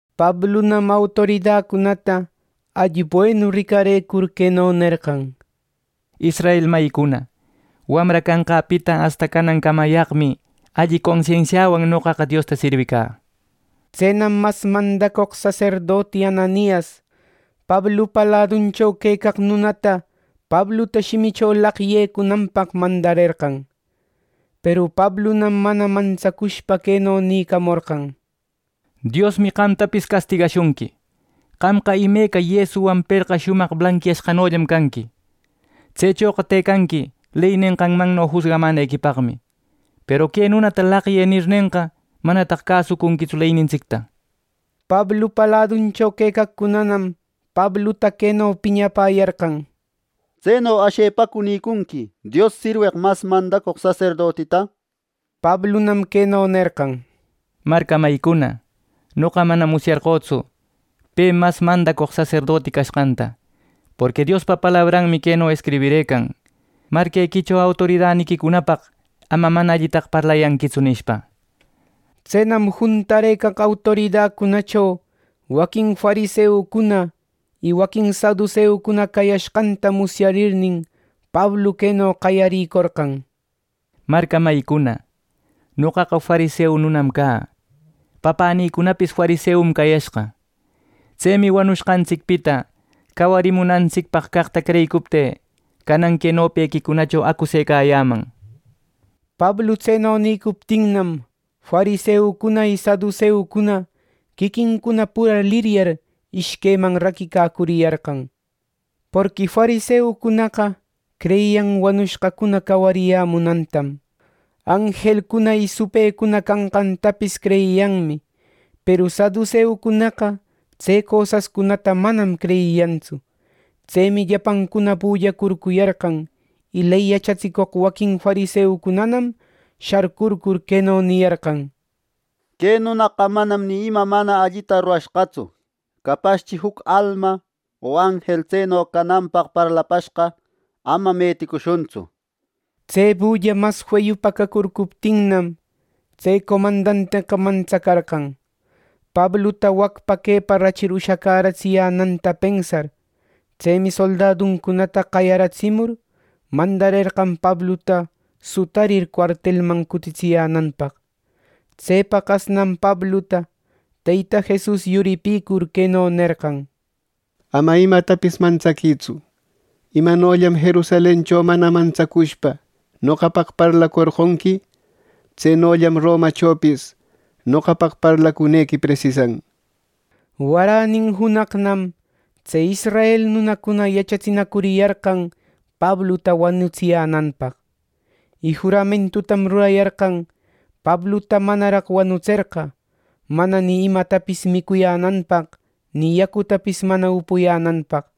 Pablunam autoridacunata alli buenu ricarecur queno nerqan: —Israel mayicuna, wamra canqäpita asta canancamayaqmi alli consensiawan noqaqa Diosta sirwicä —nir. Tsenam mas mandacoq saserdoti Ananias, Pablupa laduncho quecaq nunata Pabluta shimicho laqyecunanpaq mandarerqan. Peru Pablunam mana mantsacushpa queno nïcamorqan: —¡Diosmi qamtapis castigashunqui, qamqa imeca yesuwan perqa shumaq blanquiyashqanollam canqui! ¡Tsechoqa tëcanqui ley nenqanmanno jusgamanequipaqmi; peru “Que nunata laqyë” nirnenqa, manataq cäsuconquitsu leynintsicta! Pablupa laduncho quecaqcunanam Pabluta queno piñapäyarqan: —¿Tseno ashepacu nïcunqui Dios sirweq mas mandacoq saserdotita? —nishpa. Pablunam queno nerqan: —Marca mayïcuna, noqa manam musyarqötsu pe mas mandacoq saserdoti cashqanta; porqui Diospa palabranmi queno escribirëcan: ‘Marquequicho autoridaniquicunapaq ama mana allitaqa parlayëtsu’ nishpa. Tsenam juntarëcaq autoridacunacho waquin fariseucuna y waquin saduseucuna cayashqanta musyarnin, Pablu queno qayarïcorqan: —Marca mayicuna, noqaqa fariseu nunam cä. Papänïcunapis fariseum cayashqa. Tsemi wanushqantsicpita cawarimunantsicpaq caqta creyicuptï canan que nopequicunacho acusecayäman —nishpa. Pablu tseno nïcuptinnam, fariseucuna y saduseucuna quiquincuna pura liryar ishqueman raquicacuriyarqan. Porqui fariseucunaqa creyiyan wanushqacuna cawariyämunantam. Anjelcuna y supëcuna canqantapis creyiyanmi, peru saduseucunaqa tse cosascunata manam creyiyantsu. Tsemi llapancuna bullacurcuyarqan, y ley yachatsicoq waquin fariseucunanam sharcurcur queno niyarqan: —Que nunaqa manam ni ima mana allita rurashqatsu, capaschi juc alma o anjel tseno cananpaq parlapashqa. Ama meticushuntsu —nir. Tse bulla mas feyupa cacurcuptinnam, tse comandanteqa mantsacarqan, Pabluta wacpa quepa rachir ushacäratsiyänanta pensar. Tsemi soldaducunata qayaratsimur, mandarerqan Pabluta sutarir cuartelman cutitsiyänanpaq. Tse paqasnam Pabluta Teyta Jesus yuripur queno nerqan: “Ama imatapis mantsaquïtsu. Imanollam Jerusalencho mana mantsacushpa noqapaq parlacorqonqui; tsenollam Romachopis noqapaq parlacunequi presisan” nishpa. Waränin junaqnam tse israel nunacunana yachatsinacuriyarqan Pabluta wanutsiyänanpaq. Y juramentutam rurayarqan Pabluta manaraq wanutserqa mana ni imatapis micuyänanpaq ni yacutapis mana upuyänanpaq.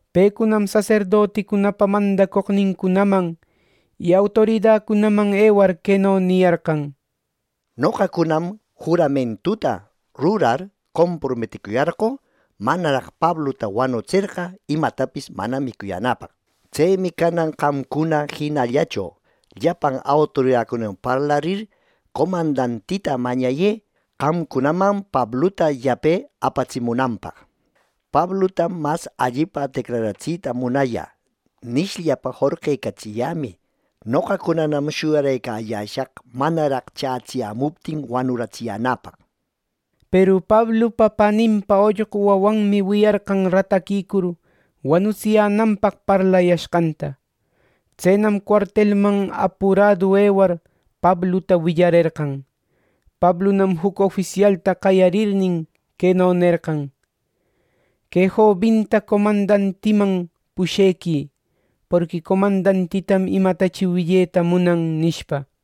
Pecunam saserdoticunapa mandacoqnincunaman y autoridacunaman ewar queno niyarqan: —Noqacunam juramentuta rurar comprometicuyarqö manaraq Pabluta wanutserqa imatapis mana micuyänäpaq. Tsemi canan qamcuna jinallacho llapan autoridacunawan parlarir comandantita mañayë qamcunaman Pabluta yape apatsimunanpaq. ‘Pabluta mas allipa declaratsita munayä’ nishllapa jorqecatsiyämï. Noqacunanam shuyarëcayäshaq manaraq chätsiyämuptin wanuratsiyänäpaq. Peru Pablupa paninpa ollqu wawanmi wiyarqan rataquicur wanutsiyänanpaq parlayashqanta. Tsenam cuartelman apuradu ewar Pabluta willarerqan. Pablunam juc ofisialta qayarirnin, queno nerqan: —Que jobinta comandantiman pushequï, porqui comandantitam imatachi willeta munan —nishpa.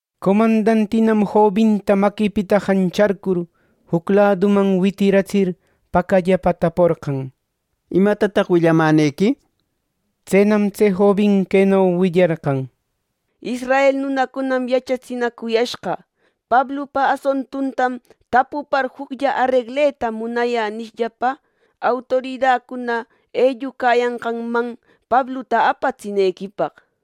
Comandantinam jobinta maquipita jancharcur juc laduman witiratsir pacallapa taporqan: —¿Imatataq willamänequi? —nishpa. Tsenam tse jobin queno willarqan: —Israel nunacunam yachatsinacuyashqa, ‘Pablupa asuntuntam tapupar juclla aregleta munayä’ nishllapa, autoridacuna ellucayanqanman Pabluta apatsinequipaq.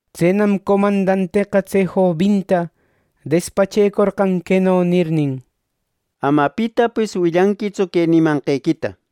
Tsenam comandanteqa tse jobinta despachecorqan queno nirnin: —Ama pitapis willanquitsu que nimanqequita —nishpa.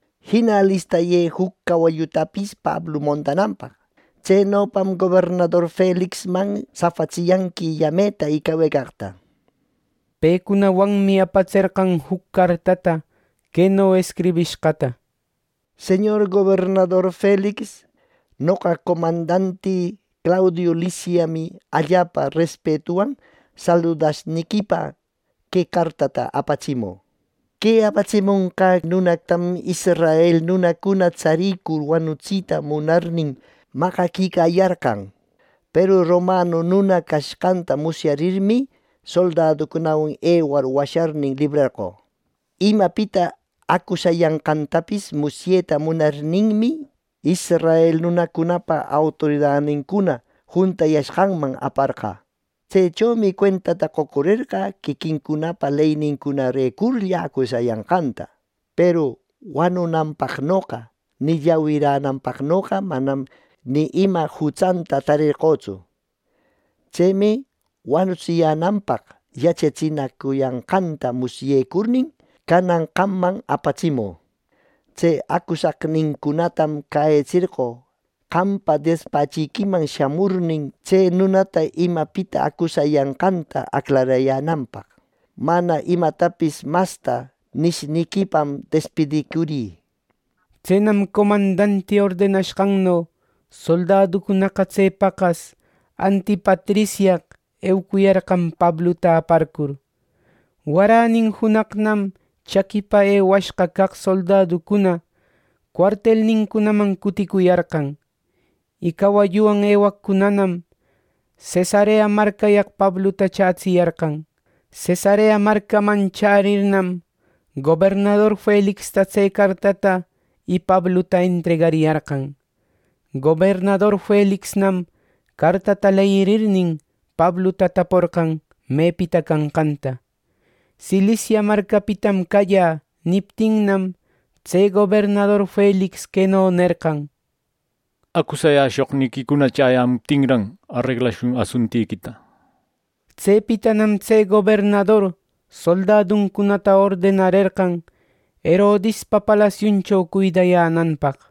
Jina alistayë juc cawallutapis Pablu montananpaq. Tsenopam Gobernador Felixman safatsiyanqui yameta y cawecaqta. Pecunawanmi apatserqan juc cartata queno escribishqata: “Señor gobernador Felix, noqa comandanti Claudiu Lisiasmi allapa respetuwan saludashniquipa que cartata apatsimü. Que apatsimonqä nunatam israel nunacuna tsarircur wanutsita munarnin maqaquicayarqan. Peru romanu nuna cashqanta musyarirmi, soldaducunawan ewar washarnin librarqö. Imapita acusayanqantapis musyeta munarninmi, israel nunacunapa autoridanincuna juntayashqanman aparqä. Tsechomi cuentata qocurerqä quiquincunapa leynincunarecurlla acusayanqanta. Peru wanunanpaqnoqa ni llawirananpaqnoqa manam ni ima jutsanta tarerqötsu. Tsemi wanutsiyänanpaq yachatsinacuyanqanta musyecurnin, canan qamman apatsimü. Tse acusaqnincunatam cäyitserqö qampa despachiquiman shamurnin, tse nunata imapita acusayanqanta aclarayänanpaq. Mana imatapis masta nishniquipam despidïcurï.” Tsenam comandanti ordenashqanno soldaducunaqa tse paqas Antipatrisyaq eucuyarqan Pabluta aparcur. Waränin junaqnam chaquipa ewashqa caq soldaducuna cuartelnincunaman cuticuyarqan, y cawalluwan ewaqcunanam Cesarea marcayaq Pabluta chätsiyarqan. Cesarea marcaman chärirnam gobernador Felixta tse cartata y Pabluta entregariyarqan. Gobernador Felixnam cartata leyirirnin Pabluta taporqan mepita canqanta. “Cilicia marcapitam callä” niptinnam, tse gobernador Felix queno nerqan: —Acusayäshoqniquicuna chäyämuptinran, areglashun asuntiquita. Tsepitanam tse gobernador soldaducunata ordenarerqan Herodispa palasiuncho cuidayänanpaq.